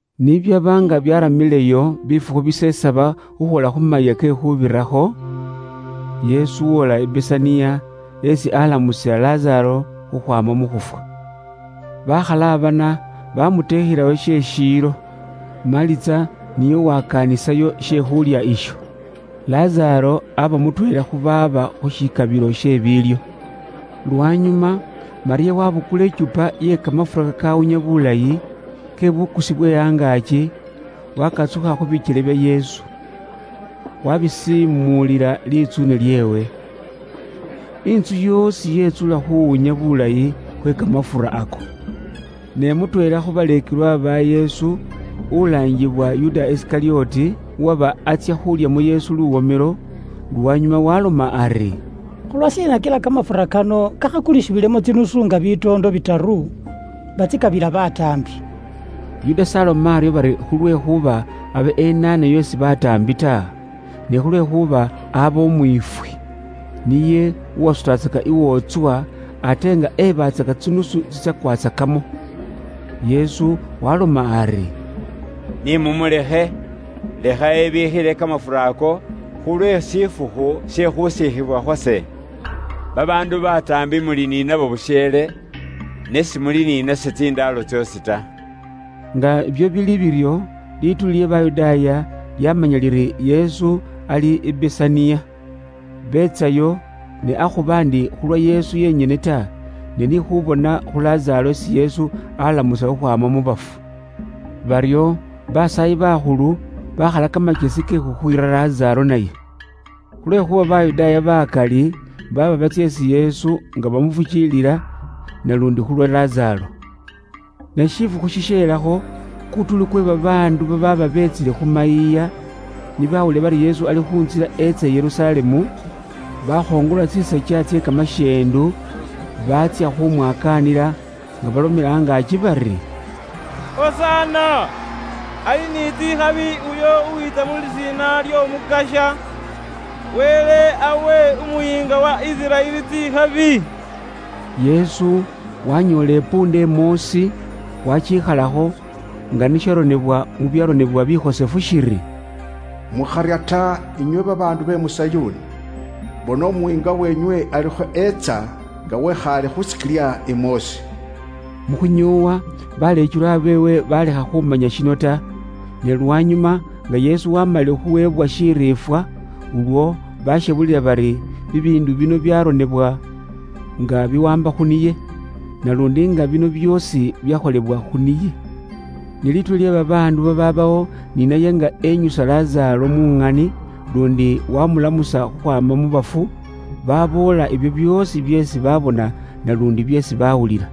Ni byaba nga byaramileyo bifukhu bisesaba khukhwoola khu Mayiiya ke Khuubirakho, Yesu woola i Besaniya, esi alamusila Lazaaro khukhwaama mu khufwa. Bakhalabana, bamuteekhelayo she shiilo. Maliza niye uwakaanisayo she khulya isho. Lazaaro aba mutweela khu baaba khu shikabilo she biilyo. Lwanyuma Malyamu wabukula ikyupa iye kamafura kakawunya bulayi, ke bukusi bwe angaaki, wakahakha khu bikyele bya Yesu. Wabisiimulila litsuune lyeewe. Intsu yoosi yetsula khuwunya bulayi khwe kamafura ako. Ne mutweela khu baleekelwa ba Yesu ulaangibwa Yuda Isikalyoti, uwaba atsya khulyamo Yesu luwomelo, lwanyuma waaloma ari, “Khulwashiina kila kamafura kano kakhakulisibwilemo tsidinari nga bitoondo bitaru, batsikabila bataambi?” Yuda s'aloma aryo bari khulwekhuuba abe enaanayo isi bataambi ta, ne khulwekhuuba aba umwiifwi. Niye uwasutatsaka iwootswa, ate nga ebaatsaka tsinusu tsitsakwatsakamo. Yesu waaloma ari, “Ni mumulekhe. Lekha ebiikhile kamafura ako, khulwe shifukhu she khusiikhibwa khwase. Babaandu bataambi muli ni nabo busheele, ne simuli ni nase tsindaalo tsoosi ta.” Nga ibyo bili biryo, lituuli lye Bayudaaya lyamanya liri Yesu ali i Besaniya. Betsayo, ne akhuba ndi khulwa Yesu yenyene ta, ne ni khubona khu Lazaaro isi Yesu alamusa khukhwaama mu bafu. Baryo Basaayi bakhulu bakhala kamakyesi ke khukhwiira Lazaaro naye. Khulwekhuuba Bayudaaya bakali baaba batsya isi Yesu nga bamufukiilila, naluundi khulwa Lazaaro. Ne shifukhu shisheelakho, kutuuli kwe babaandu babaaba beetsile khu mayiiya, ni bawulila bari Yesu ali khu ntsila etsa i Yerusalemu, bakhongola tsisakya tsye kamashendu baatsya khumwakaanila nga balomela angaaki bari, “Hosana, ali ni tsikhabi uyo uwiitsa mu lisiina ly'Omukasya. Wele awe Umuyiinga wa Isiraeli tsikhabi.” Yesu wanyoola isikilya imoosi, waakikhalakho, nga ni sharonebwa mu byaronebwa bikhosefu shiri, “Mukharya ta, inywe babaandu be mu Sayuuni; Bona Umuyiinga wenywe alikho etsa nga wikhaale khu sikilya imoosi.” Mu khunyoowa baleekelwa beewe baalekha khumanya shino ta; ne lwanyuma nga Yesu waamalile khuweebwa shiriifwa, ulwo bashebulila bari bibiindu bino byaronebwa nga biwaamba khu niye. Naluundi nga bino byoosi byakholebwa khu niye. Ni lituuli lye babaandu babaabawo ni naye nga enyusa Lazaaro mu ŋani luundi wamulamusa khukhwaama mu bafu, baboola ibyo byoosi byeesi baabona naluundi byeesi baawulila.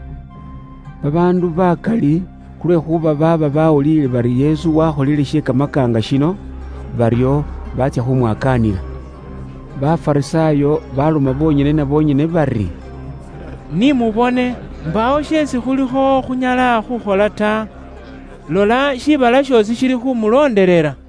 Babaandu bakali khulwekhuuba baaba bawuliile bari Yesu wakholile she kamakaanga shino, baryo baatsya khumwakaanila. Bafarisaayo baloma bonyene na bonyene bari, “Ni mubone, mbaawo sheesi khulikho khunyala khukhola ta! Lola shiibala shoosi shilikhumulondelela.”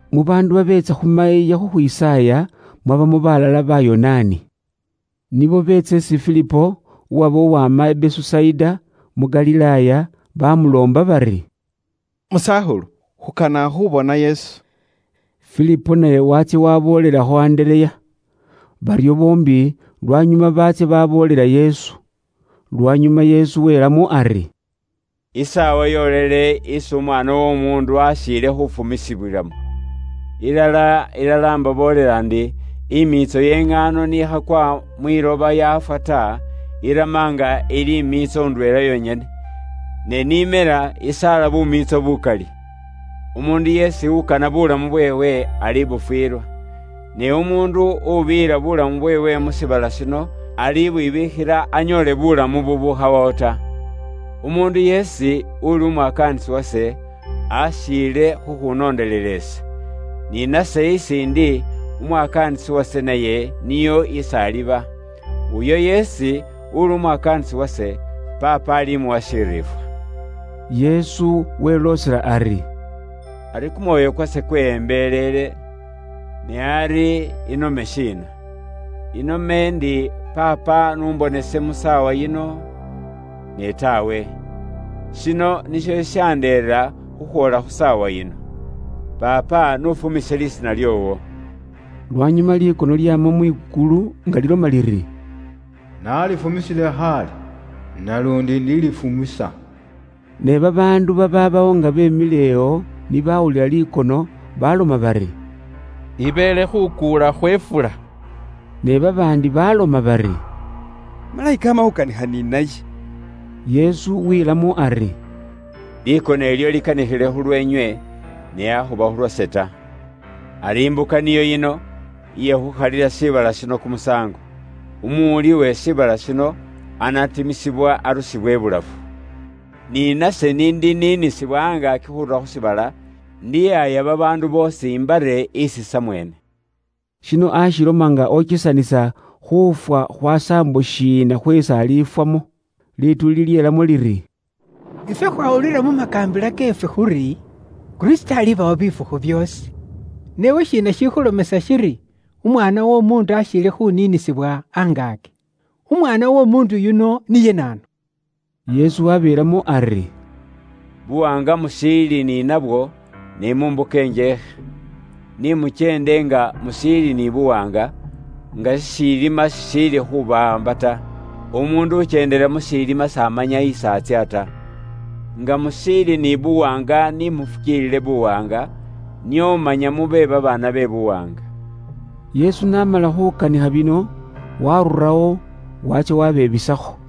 Mu baandu babeetsa khu mayiiya khukhwisaaya, mwabamo balala Bayonaani. Nibo beetsa isi Filipo, uwaba uwama i Besusaida, mu Galilaaya, bamuloomba bari, “Musakhulu, khukana khubona Yesu.” Filipo naye waatsya waboolelakho Andereya. Baryo boombi lwanyuma baatsya baboolela Yesu. Lwanyuma Yesu welamo ari, “Isaawa yoolele isi Umwaana w'Omuundu ashiile khufumisibwilamo. Ilala, ilala, imbaboolela ndi, imiitso ye iŋaano ni khakwa mwiloba yaafwa ta, irama nga ili imiitso indweela yonyene. Ne n'imela, isaala bumiitso bukali. Umuundu yeesi ukana buulamu bweewe, alibufwilwa. Ne umuundu ubiyila buulamu bweewe mu shiibala shino, alibwibiikhila anyoole buulamu bubukhawawo ta. Umuundu yeesi uli umwakaanisi wase, ashiile khukhunondelela ise. Ni nase isi ndi, umwakaanisi wase naye niyo isi aliba. Uyo yeesi uli umwakaanisi wase, Paapa alimuwa shiriifwa.” Yesu weloosela ari, “Ari kumwoyo kwase kweyembelele. Ne ari inome shiina? Inome ndi Paapa n'umbonese mu saawa yino? Ne taawe, shino nisho shishandeera khukhwoola khu saawa yino. Paapa, n'ufumise lisiina lyoowo.” Lwanyuma likono lyama mwikulu nga liloma liri, “Nalifumisile khaale, naluundi indilifumisa.” Ne babaandu babaabawo nga beemilewo ni bawulila likono, baloma bari, “Ibeele khukuula khwe ifula.” Ne babaandi baloma bari, “Malayika ama khukanikha ni naye.” Yesu wilamo ari, “Likono ilyo likanikhile khulweenywe, ne akhuba khulwase ta. Ari imbuka niyo yino, iye khukhalila shiibala shino kumusaango. Umuwuli uwe shiibala shino anatimisibwa arusibwe ibulafu. Ne nase n'indiniinisibwa angaaki khurura khu shiibala, indihaaya babaandu boosi imbare isi samweene.” Shino aashiloma nga okesanisa khuufwa khwa saambo shiina khweesi alifwamo. Lituuli lyeelamo liri, “Ifwe khwawulila mu makaambila keefwe khuri Kristo alibawo bifukhu byoosi. Ne iwe shiina shikhulomesa shiri Umwaana w'Omuundu ashiile khuniinisibwa angaaki? Umwaana w'Omuundu yuno, niye naanu?” Yesu wabeelamo ari, “Buwaanga mushiili ni nabwo, ne mu mbuka injeekhe. Ni mukyende nga mushiili ni buwaanga, nga shishiilima shishiili khubawaamba ta. Umuundu ukyendela mu shilima s'amanya esi atsya ta. Nga mushiili ni buwaanga ni mufukiilile buwaanga, nio manya mube babaana be buwaanga.” Yesu n'amala khukanikha bino, waarurawo waatsya wabebisakho.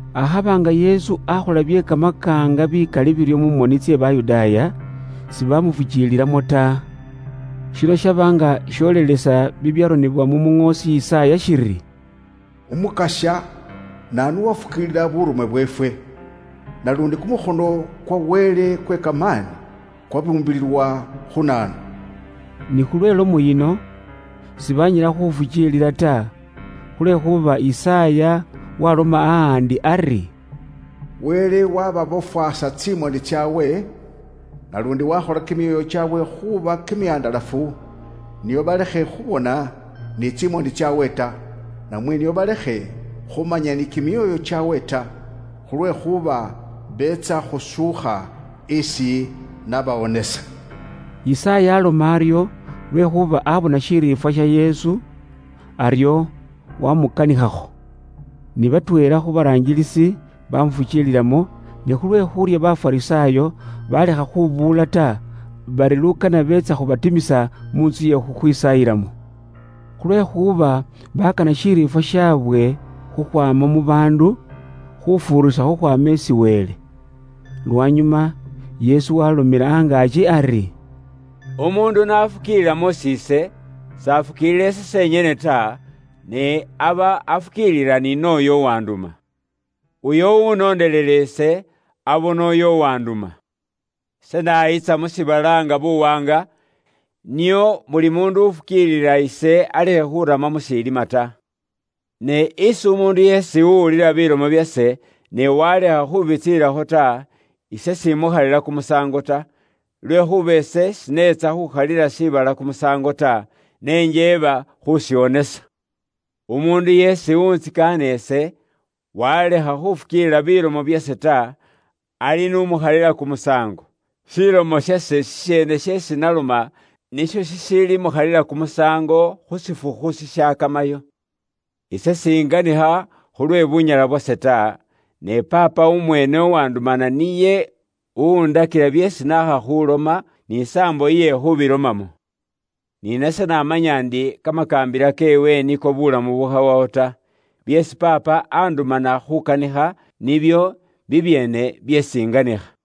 Akhaba nga Yesu akhola bye kamakaanga bikali biryo mu moni tsye Bayudaaya, sibamufukiililamo ta. Shino shaba nga sholelesa bibyaronebwa mu muŋoosi Yisaaya shiri, “Umukasya, naanu uwafukiilila buurume bweefwe? Naluundi, kumukhono kwa Wele kwe kamaani kwabimbulilwa khu naanu?” Ni khulwe ilomo yino, sibaanyala khufukiilila ta, khulwekhuuba Yisaaya waloma ahandi ari, “Wele wababofwaasa tsimoni tsaabwe. Naluundi waakhola kimyoyo kyaabwe khuuba kimihandalafu, nio balekhe khubona ni tsimoni tsaabwe ta, namwe nio balekhe khumanya ni kimyoyo kyaabwe ta, khulwekhuuba beetsa khushuukha, ise nabawonesa.” Yisaaya aloma aryo lwekhuuba abona shiriifwa sha Yesu; aryo wamukanikhakho. Ni batweela khu baraangilisi bamufukiililamo, ne khulwe khuurya Bafarisaayo, balekha khubuula ta, bari lukana beetsa khubekalawo khutsya mu ntsu iye khukhwisaayilamo. Khulwekhuuba bakana shiriifwa shabwe khukhwaama mu baandu, khufuurisa khukhwaama isi Wele. Lwanyuma Yesu waalomela angaaki ari, “Umuundu n'afukiilila mus'iise, s'afukiilila ise senyene ta, ne aba afukiilila ni nooyo uwanduma. Uyo uwunondelela ise, abona uyo uwanduma. Ise nayiitsa mu shiibala nga buwaanga, nio buli muundu uwufukiilila ise alekhe khurama mu shilima ta. Ne isi umuundu yeesi uwulila bilomo byase, ne walekha khubitsiilakho ta, ise s'imukhalila kumusaango ta. Lwekhuuba ise shineetsa khukhalila shiibala kumusaango ta, ne njeeba khushiwonesa. Umuundu yeesi uwuuntsikaana ise, walekha khufukiilila bilomo byase ta, ali n'umukhalila kumusaango. Shilomo shase shisheene sheesi naloma nisho shishiilimukhalila kumusaango khu shifukhu shishakamayo. Ise s'inganikha khulwe bunyala bwase ta, ne Paapa umweene uwandumana niye uwundakila byeesi naakha khuloma; n'isaambo iye khubilomamo. Ni nase namanya ndi kamakaambila keewe niko bulamu bubukhawawo ta. Byeesi Paapa andumana khukanikha, nibyo bibyeene byeesi inganikha.”